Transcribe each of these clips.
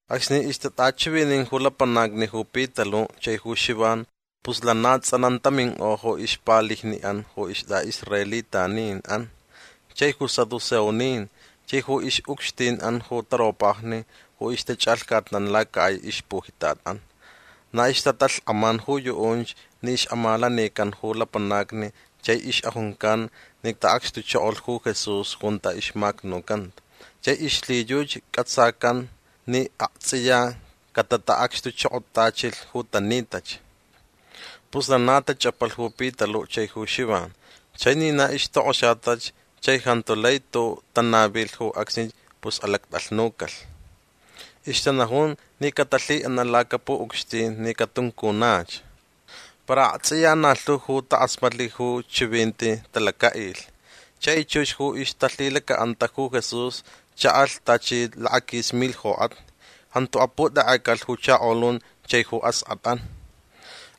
Acsni ixtatʼachivinin ju lapanacni ju Pitaluʼ chai ju Xivan pus lana tsʼanan taminkʼo ju ixpalijniʼan ju istʼaʼisraelitaninʼan chai ju saduceonin chai ju ixʼucxtinʼan ju taropajni ju ixtachʼalhcatnan lacakʼai ixpujitatʼan. Na ixtatalhkʼaman ju yuʼunch ni ixʼamalanican ju lapanacni chai ixʼajuncan ni taʼacxtuchokolh ju Jesús junta ixmacnucanta chai ixlhiyuchi cʼatsacan ni aktsʼiya catataʼacxtuchokotachilh ju tanitach. Pus lana tachʼapalh ju Pitaluʼ chai ju Xivan. Chai ni na ixtokʼoxatach chai jantu lai tuʼuʼ tanavilh ju acsnich pus alactʼalhnucalh. Ixtanajun ni catalhiʼanaʼ lacapuʼucxtin ni catuncunach. Para aktsʼiya na lhu ju takʼasmatlh ju chivinti talacaʼilh. Chai chux ju ixtalhilacaʼanta ju Jesús chaʼalh tachi lakaquis milh jokʼatni. Jantu aputekʼecalh ju chakolun chai ju askʼatʼan.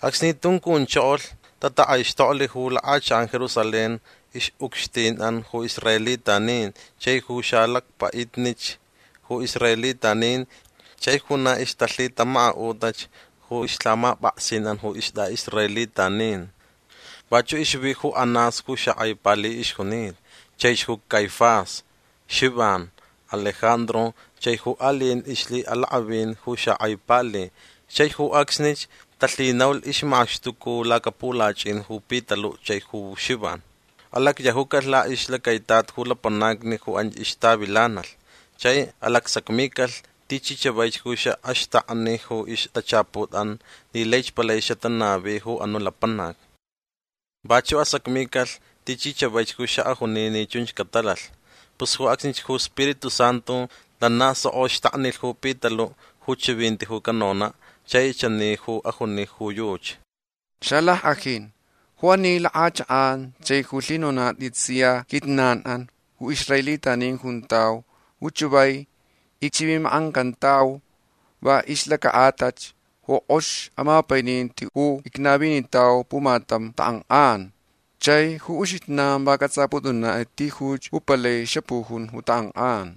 Acsni tuncunchokolh tatakʼaixtoklh ju lakʼachakʼan Jerusalén ixʼucxtinʼan ju israelitanin chai ju xalacpaʼitnich ju israelitanin chai ju na ixtalhitamakaʼutach ju ixlhamapʼaksinʼan ju istʼaʼisraelitanin. Vachuʼ ixvi ju Anás ju xakʼai pali ixjunita. Chaich ju Caifás, Xivan, Alejandro chai ju aliʼin ixlhiʼalakʼavin ju xakʼai pali. Chai ju acsnich talhinaulh ixmaxtuca lacapulachʼin ju Pitaluʼ chai ju Xivan. Alacyajucalh laʼixlacaitat ju lapanacni ju anch ixtavilanalh chai alacsacmicalh tichi chavaich ju xaʼaxtakni ju ixtachaputʼan ni laich palai xatanavi ju anuʼ lapanac. Vachuʼ asacmicalh tichi chavaich ju xaʼajuni ni chunch catalalh. Pus ju acsnich ju Spiritu Santu lana soko xtaknilh ju Pitaluʼ ju chivinti ju canonaʼ. Chai chani ju ajuni ju yuchi: ―Xalackʼajin ju ani lakʼachakʼan chai ju lhinonatʼit sia quijnanʼan ju israelitanin juntau ju chavai icchivimakʼancantau va ixlacaʼatalh ju kʼox amapaininti ju icnavinitau pumatam takʼankʼan. Chai ju uxijnan va cʼatsʼapʼutʼunatʼit tijuch ju palai xapujun ju takʼankʼan.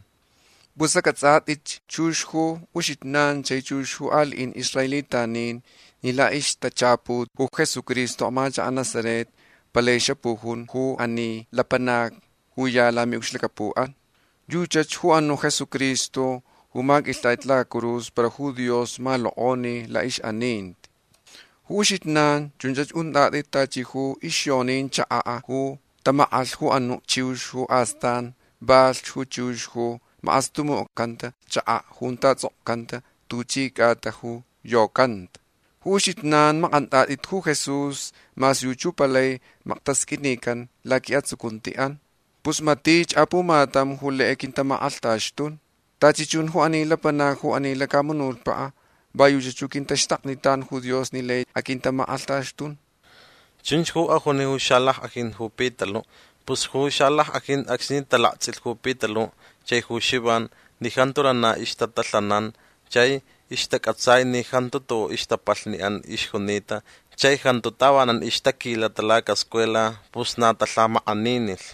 Pus acʼatsʼatʼitch chux ju uxijnan chai chux ju aliʼin israelitanin ni laʼixtachaput ju Jesucristo amachakaʼ Nazaret palaich xapujun ju ani lapanac ju ya lamiʼucxlacapuʼan. Yuchach ju anuʼ Jesucristo ju maqʼuilhtʼatʼit lacacurus para ju Dios malokʼoni laʼixʼaninti. Ju uxijnan chun untʼatʼit tachi ju ixyonin chakaʼ ju tamakʼalh ju anuʼ chiux ju astan valh ju chiux ju makʼastumucʼacanta chakaʼ junta tsʼokcanta tuchi cʼatach ju yocanta. Ju uxijnan makʼantʼatʼit ju Jesús mas yuchi ju palai maktasqʼuinican laquiʼatsucuntiʼan. Pus matich apumatam ju lai aquintamakʼalhtaxtun. Tachi chun ju lapanacni ju ani lacamunutpaʼ va yuchach ju quintaxtaknitan ju Dios ni lai aquintamakʼalhtaxtun. ―Chunch ju ajuni ju xalackʼajin ju Pitaluʼ. Pus ju xalackʼajin acsni talaktsʼilh ju Pitaluʼ chai ju Xivan ni jantu lana ixtatalhanan chai ixtacʼatsai ni jantu tuʼuʼ ixtapalhniʼan ixjunita chai jantu tavanan ixtaquilata lacascuela pus na talhamakʼaninilh.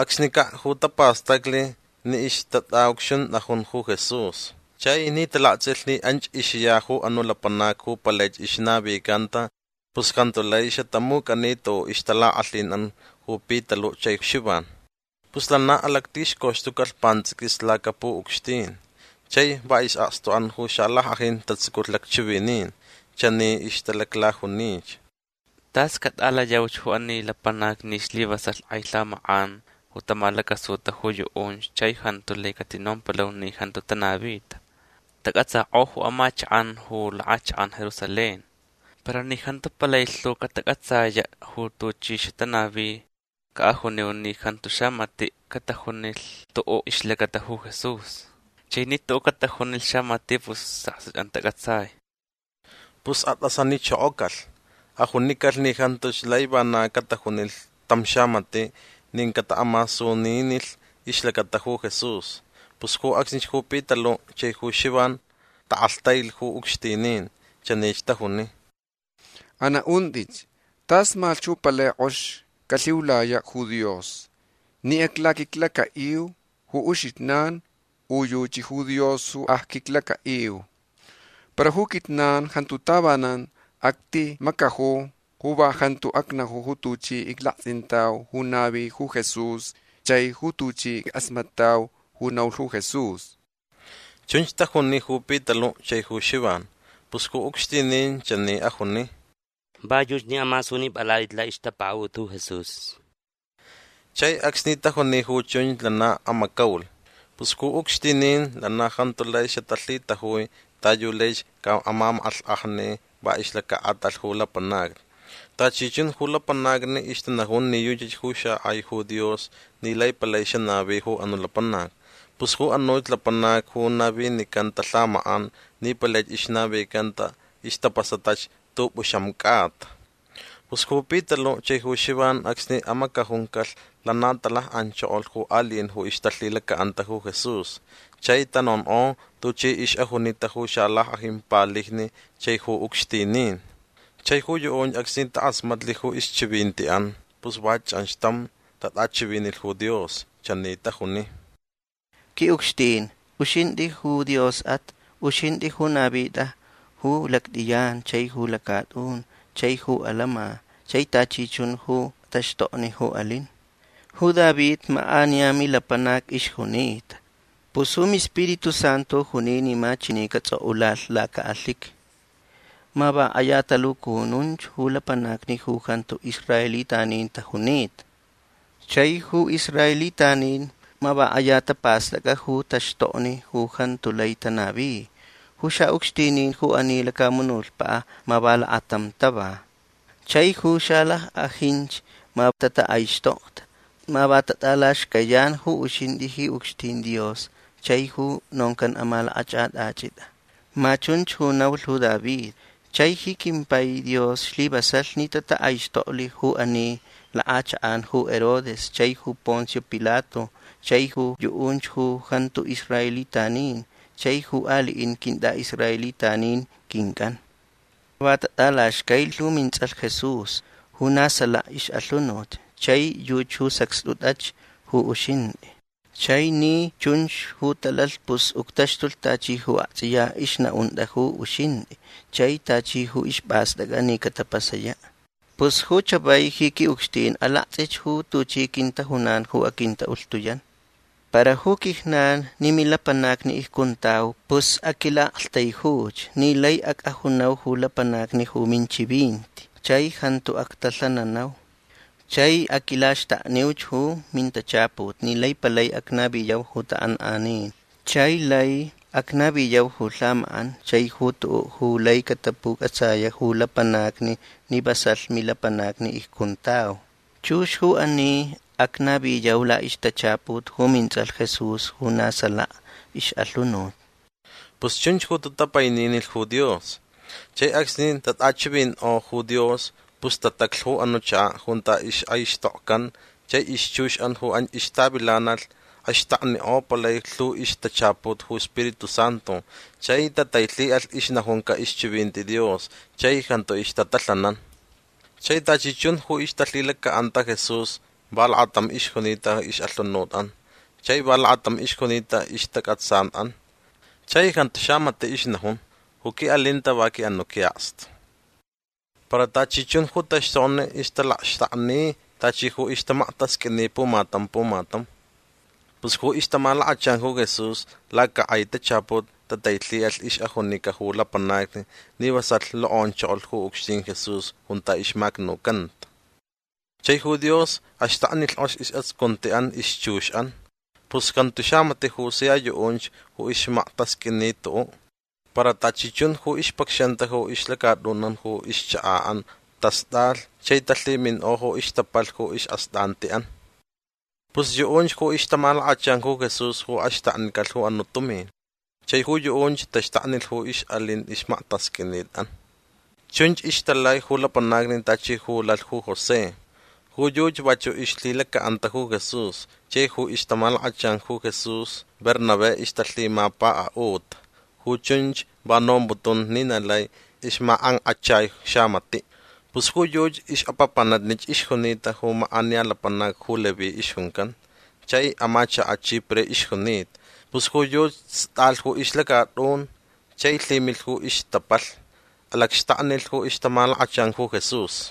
Acsnicaʼ ju tapastaclh ni ixtatʼaʼucxuntʼajun ju Jesús. Chai ni talaktsʼilh ni anch ixya ju anuʼ lapanac ju palaich ixnavicanta pus jantu lai xatamucʼani tuʼuʼ ixtalakʼalhinʼan ju Pitaluʼ chai Xivan. Pus lana alactixcoxtucalh pantsʼiquis lacapuʼucxtin. Chai va isʼakstuʼan ju xalackʼajin tatsuculh lacchivinin. Chani ixtalaclajunich: ―Tas catʼalayauch ju ani lapanacni ni slivasalh kʼai lhamakʼan ju tamalacasuta ju yuʼunch chai jantu lai catinompalau ni jantu tanavita. Tacʼatsakʼo ju amachakʼan ju lakʼachakʼan Jerusalén. Para ni jantu palai lhu catacʼatsayaʼ ju tuchi xatanavi caʼajuniu ni jantu xamatiʼ catajunilh tuʼuʼ ixlacata ju Jesús. Chai ni tuʼuʼ catajunilh xamatiʼ pus isʼakstuʼan tacʼatsai. Pus atʼasanichokocalh. Ajunicalh ni jantuch lai vana catajunilh tam xamatiʼ nin cataʼamasuninilh ixlacata ju Jesús. Pus ju acsnich ju Pitaluʼ chai ju Xivan takʼalhtailh ju ucxtinin. Chanich tajuni: ―Anaʼuntʼitch. Tasmalhch ju palai kʼox calhiulayaʼ ju Dios. Ni aclaquiclacaʼiu ju uxijnan u yuchi ju Dios ju acquiclacaʼiu. Para ju quijnan jantu tavanan actimacaju ju va jantuch acnaju ju tuchi iclaktsʼintauch ju navilh ju Jesús chai ju tuchi ickʼasmatʼauch ju naulh ju Jesús. ―Chunch tajuni ju Pitaluʼ chai ju Xivan. Pus ju ucxtinin chani ajuni: ―Va yuchi ni amasunipʼalatʼit laʼixtapakaʼut ju Jesús. Chai acsni tajuni ju chunch lana amacaulh. Pus ju ucxtinin lana jantu lai xatalhitajui ta yu laich caʼamamakʼalhkʼajni va ixlacaʼatalh ju lapanacni. Tachi chun ju lapanacni ixtanajun ni yuchach ju xakʼai ju Dios ni lai palai xanavi ju anuʼ lapanac. Pus ju anuch lapanac ju navinicanta lhamakʼan ni palaich ixnavicanta ixtapasatach tʼupʼuxam cʼata. Pus ju Pitaluʼ chai ju Xivan acsni amacajuncalh lana talakʼanchokolh ju aliʼin ju ixtalhilacaʼanta ju Jesús. Chai tanonkʼo tuchi ixʼajuni ju xalackʼajin palijni chai ju ucxtinin. Chai ju yuʼunch acsni takʼasmatlh ju ixchivintiʼan pus va chʼanxtam tatʼachivinilh ju Dios. Chani tajuni: ―Quiʼucxtin uxintʼi ju Diosʼat. Uxintʼi ju navitʼa ju lactʼiyan chai ju lacatʼun chai ju alama chai tachi chun ju taxtokni ju alin. Ju David makʼaniya milapanac ixjunita. Pus ju miSpiritu Santu juni ni ma chani catsʼokʼulalh lacaʼalhiqui: Ma va kʼaya talucununch ju lapanacni ju jantu israelitanin tajunita. Chai ju israelitanin ma va kʼaya tapastʼacʼa ju taxtokni ju jantu lai tanavi. Ju xaʼucxtinin ju ani lacamunutpaʼ ma va lakatam tava. Chai ju xalackʼajinch ma tatakʼaixtokta. Ma va tatʼalaxcayan ju uxintʼi ji ucxtin Dios chai ju noncan amalakʼachʼatʼachʼitʼa. Ma chunch ju naulh ju David. Chai ji quimpai Dios slivasalh ni tatakʼaixtoklh ju ani lakʼachakʼan ju Herodes chaich ju Poncio Pilato chaich ju yuʼunch ju jantu israelitanin chai ju aliʼin quintʼaʼisraelitanin quincʼan. Va tatʼalaxcailh ju mintsʼalh Jesús ju na salaka ixʼalhunut. Chai yuchi ju sacxtʼutʼach ju uxintʼi. Chai ni chunch ju talalh pus uctaxtulh tachi ju aktsʼiya ixnaʼuntʼa ju uxintʼi chai tachi ju ispʼastʼactʼa ni catapasayaʼ. Pus ju chavai ji quiʼucxtin alaktsʼich ju tuchi quintajunan ju aquintaʼulhtuyan. Para ju quijnan ni milapanacni icjuntau pus aquilaʼaktaijuch ni laich acʼajunau ju lapanacni ju minchivinti chai jantu actalhananau. Chai aquilaxtakniuch ju mintachaput ni laich palai acnaviyau ju takʼankʼanin chai lai acnaviyau ju lhamakʼan chai ju tuʼuʼ ju lai catapucʼatsayaʼ ju lapanacni ni vasalh milapanacni icjuntau. Chux ju ani acnaviyau laʼixtachaput ju mintsʼalh Jesús ju na salaka ixʼalhunut. ―Pus chunch ju tatapaininilh ju Dios. Chai acsni tatʼachivinkʼolh ju Dios pus tataclh ju anuʼ chakaʼ junta ixkʼaixtokcan chai ixchuxʼan ju anch ixtavilanalh axtaknikʼo palai lhu ixtachaput ju Spiritu Santu chai tatailhiʼalh ixnajunca ixchivinti Dios chai jantu ixtatalhanan. Chai tachi chun ju ixtalhilacaʼanta Jesús va lakatam ixjunita ixʼalhunutʼan chai va lakatam ixjunita ixtacʼatsanʼan. Chai jantu xamatiʼ ixnajun: ―Ju quiʼalinta va quiʼanuʼ quiʼakstu. Para tachi chun ju taxtokni ixtalaxtakni tachi ju ixmaktasqʼuini pumatam pumatam. Pus ju ixtamalakachan ju Jesús lacakʼai tachaput tatailhiʼalh ixʼajunica ju lapanacni ni vasalh lokʼonchokolh ju ucxtin Jesús junta ixmacnucanta. Chai ju Dios axtaknilh kʼox isʼatsucuntiʼan ixchuxʼan. Pus jantu xamatiʼ ju sia yuʼunch ju ixmaktasqʼuini tuʼuʼ. Para tachi chun ju ixpacxanta ju ixlacatʼunʼan u ixchakaʼan tastʼalh chai talhiminkʼo ju ixtapalh ju isʼastʼantiʼan. Pus yuʼunch ju ixtamalakachan ju Jesús ju axtaknicalh ju anuʼ tumin chai ju yuʼunch taxtaknilh ju ixʼalin ixmaktasqʼuinitʼan. Chunch ixtalai ju lapanacni tachi ju lalh ju José. Ju yuchi vachuʼ ixlhilacaʼanta ju Jesús chai ju ixtamalakachan ju Jesús Bernabé ixtalhimapakaʼuta. Ju chunch va nomputan ni na lai ixmakʼankʼachai xamatiʼ. Pus ju yuchi ixʼapapanatnich ixjunita ju makʼaniya lapanac ju Leví ixjuncan. Chai amachakaʼ Chipre ixjunita. Pus ju yuchi stʼalh ju ixlacatʼun chai lhimilh ju ixtapalh. Alacxtaknilh ju ixtamalakachan ju Jesús.